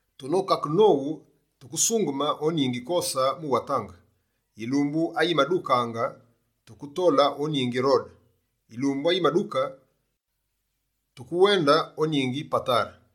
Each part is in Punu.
Tunokakene nowu, tukesungeme o ningi Kose mu watange, yilumbu ayimadukaange tuketole o ningi Rode. Yilumbu ayimaduke tukewende o ningi Patare.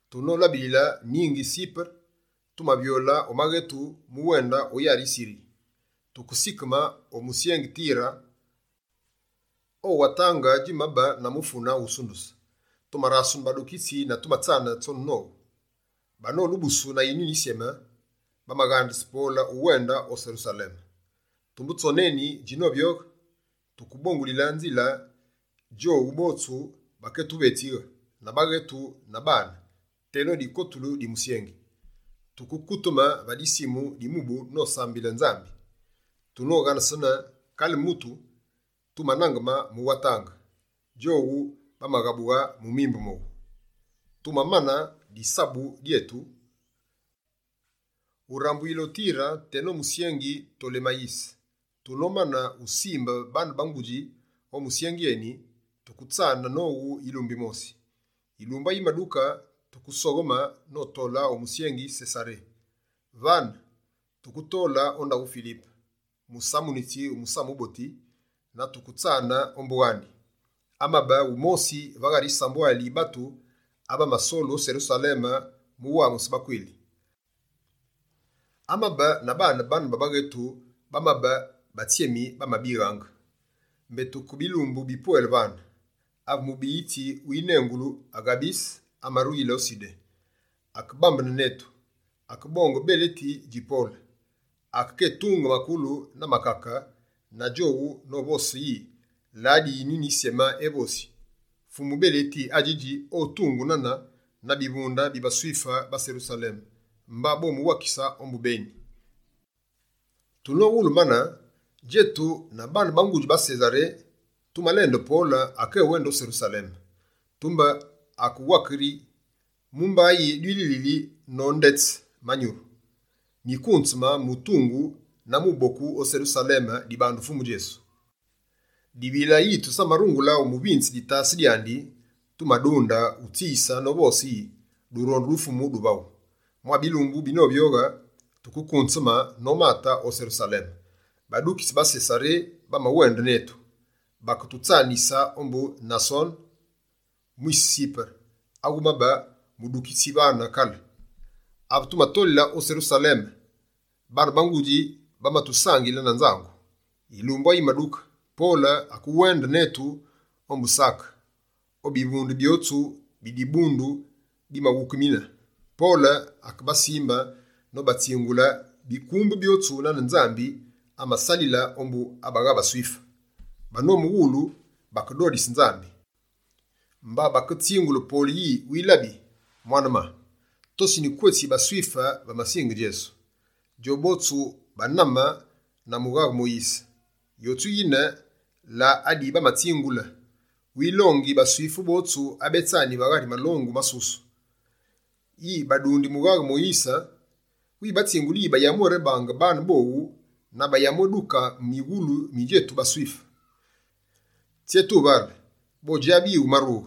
Tunolabilile ningi Sipere, tumavyole o maghetu mu wende o yari yi Siri. Tukesikeme o musyengi Tire o watange djimabe na mufune wusunduse. Tumarasene badukitsi na tumatsane tsone nowu. Banolubusu na Yinyuni Yisyeme, bamaghandise Pole uwende o Serusaleme. Tumbe tsone eni djinovyoghe, tukebongulile nzile. Djowu botsu bakétuvetsighe, na baghetu na bane, teno dikotulu di musyengi. Tuke kuteme va disimu di mubu nosambile Nyambi. Tunoghanesene kale mutu, tumanangeme mu watange. Djowu bamaghabughe mu mimbu mowu. Tumamane disabu dyetu, urambuyile o Tire teno musyengi Tolemayise. Tunomane usimbe baane ba ngudji o musyengi eni, tuketsane nowu yilumbu yimosi. Yilumbu ayimaduke, tukesogheme notole o musyengi Sesaré. Vane, tukekote o ndaghu Filipe, musamunitsi wu Musamu Wuboti na tuketsane ombu wandi. Amabe wumosi va ghari yisambwali yi batu, abamasolu o Serusaleme mu wamuse bakwili. Amabe na baane bana ba baghetu bamabe batsyemi, bamabighaange. Mbé tuke bilumbu bipwele vane, ave mubiyitsi winengulu Aghabise amaruyile o Sudé. Akebambene netu, akebonge beleti dji Pole, akekétunge makulu na makake na djoni novose yi: «La adi Yinyuni Yisyeme evosi: “Fumu beleti adjidji otungu nane na bivunde bi baSwife ba Serusaleme, mba bomuwakise ombu beni.”» Tunowulu mane, djetu na baane ba ngudji ba Sesaré tumalende Pole akéwende o Serusaleme. Tumbe akewake yi: «Mumba yi dililili nondetse manyuru? Nyikunzeme mutungu na muboku o Serusaleme dibandu Fumu Djesu.» Dibilaange yi tusamarungule umusanze ditase dyandi, tumadunde utsiyise novose yi: «Durondu du Fumu duvaghu.» Mwa bilumbu binovyoghe, tukekunzeme nomate o Serusaleme. Badukitsi ba Sesaré bamawende netu, baketutsanise ombu Nasone, mwise Sipere, awumabe mudukitsi vane kale. Ave tumatolile o Serusaleme, baane ba ngudji bamatusangile na nzangu. Yilumbu ayimaduke, Pole akewende netu ombu Sake, o bivunde byotsu bi dibundu bimaghukemine. Pole akebasimbe nobatsingule bikumbu byotsu nane Nzambi amasalile ombu abagha baSwife. Banomuwulu bakedodise Nzambi. Mba bakevaghe Pole yi: «Wilabi, mwane-ma, tosini kwe tsi baSwife bamasinge Djesu. Djobotsu baname na Mughaghe Moyise. Yotsu yine la adi bamabatsingule: “Wilongi baSwife botsu abetsani va ghari malongu masusu, yi badundi Mughaghe wu Moyise. Wibatsinguli yi bayamwérebaange baane bowu na bayamwéduke mighulu mi djetu baSwife.” Tsyé tuvale? Bodjabe yi wumarughe.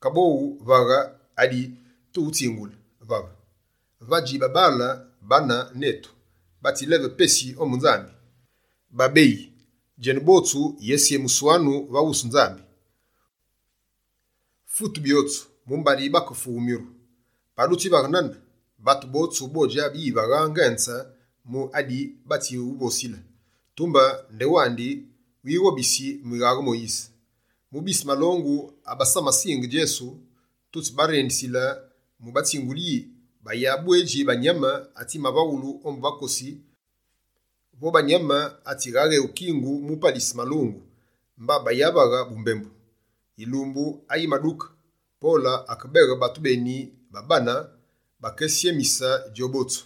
Kaboghu, vaghe adi tiwutsinguli. Vave, vadji babaale bane netu batsi leve pesi ombu Nzambi. Babeyi, djenu botsu yétsyemuswanu va wusu Nzambi. Fute byotsu mumbari bakefughu myuru. Pa dutsivaghe nane, batu botsu bodjabe yi vagha ngenze mu adi batsiwuvosile, tumbe ndewandi wighobisi mughaghe Moyise. Mu bise malongu abamasinge Djesu, tutsibarendisile mu batsingule yi: bayabwedji banyame atsivaghulu ombu bakosi vo banyame atsighaghewu kingu mu palise malungu, mba bayavaghe bumbembu.» Yilumbu ayimaduke, Pole akebeghe batu beni babane bakekésyemise djobotsu.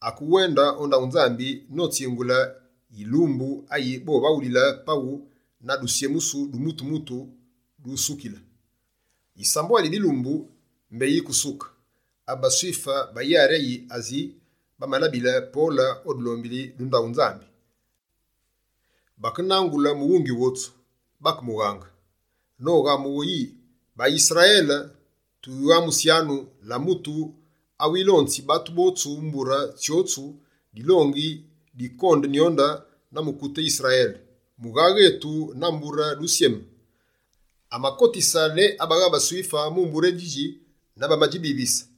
Akewende o ndaghu Nzambi notsingule yilumbu ayi bovaghulile paghu na dutsyemusu du mutu-mutu dusukile. Yisambwali yi bilumbu mbé yike usuke, ave baSwife ba yari yi Asi bamalabile Pole o dulombili du ndaghu Nzambi. Bakenangule mughungi wotsu, bakemughange, noghamughe yi: «BaYisrayele, tuwamusyanu! La mutu awilonzi batu botsu mbure tsyotsu dilongi di kondenyonde na mukute Yisrayele, mughaghe etu na mbure djisyeme. Amakotise ne abagha baSwife mu mbure édjidji na bamadjibivise.»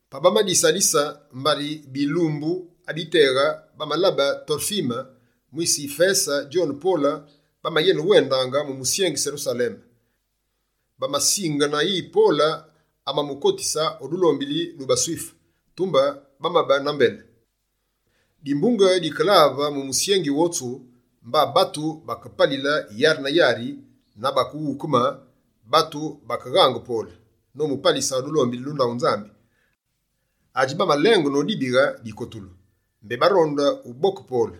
Pa bamadisalise, mbari bilumbu abiteghe bamalabe Torfime mwise Yifese djone Pole bamayenewendaange mu musyengi Serusaleme. Bamasingene yi Pole amamukotise o dulombili du baSwife, tumbe bamabe na mbele. Dimbunge dikelave mu musyengi wotsu, mba batu bakepalile yari na yari na bakeghukeme. Batu bakeghange Pole, nomupalise o dulombili du ndaghu Nzambi, adji bamalenge nobindighe dikotulu. Mbé baronde uboke Pole,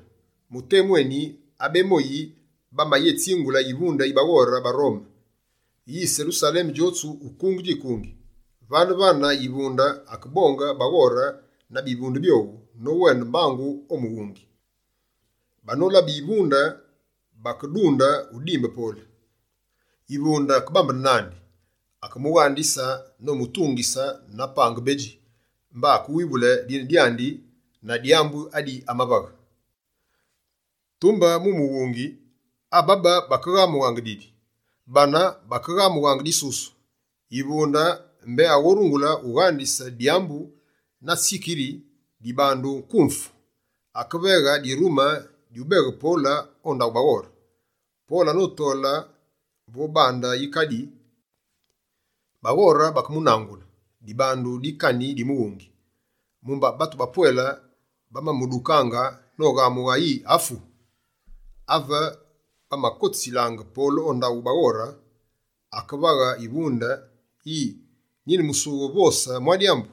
mu temu eni abemoyi bamayétsingule yivunde yi baghore ba Rome, yi Serusaleme djotsu ukunge djikungi. Vane-vane yivunde akebonge baghore na bivunde byowu, nowende mbangu o mughungi. Banolabe yivunde, bakedunde udimbe Pole. Yivunde akebambene nandi, akemughangise nomutungise na pange bedji. Mba akewivulu dine dyandi na dyambu adi amavaghe. Tumbe mu mughungi, abéba bamaghamughaange didi, bane bamaghamughaange disusu. Yivunde mbé aghorungule ughangise dyambu na tsikiri dibandu nkumfu. Akeveghe dirume dyubeghe Pole o ndaghu baghore. Pole anotole vo bande yikadi, baghore bakemunangule, dibandu dikani di mughungi. Mumba batu bapwele bamamudukaange, noghamughe yi: «Afu!» Ave bamakotisilaange Pole o ndaghu baghore, akevaghe yivunde yi: «Nine musughe uvose mwa dyambu?»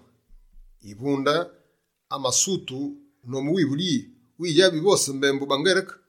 Yivunde amasutu, nomuwivule yi: «Widjabi uvose mbembu baNgereke?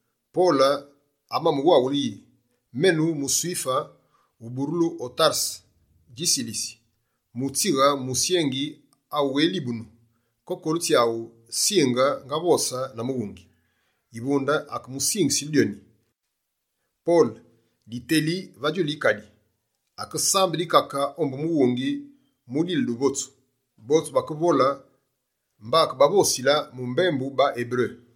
Pole amawaghule yi: «Menu muSwife, uburulu o Tarese dji Silisi, mutsighe musyengi awughélibunu. Kokolu tsyaghu, singe ngavose na mughungi.» Yivunde akemusingile dyoni. Pole, diteli va djulu yikadi, akesambe dikake ombu mughungi mudile duvotsu. Botsu bakevole «swii», mba akebavosile mu mbembu baEberu.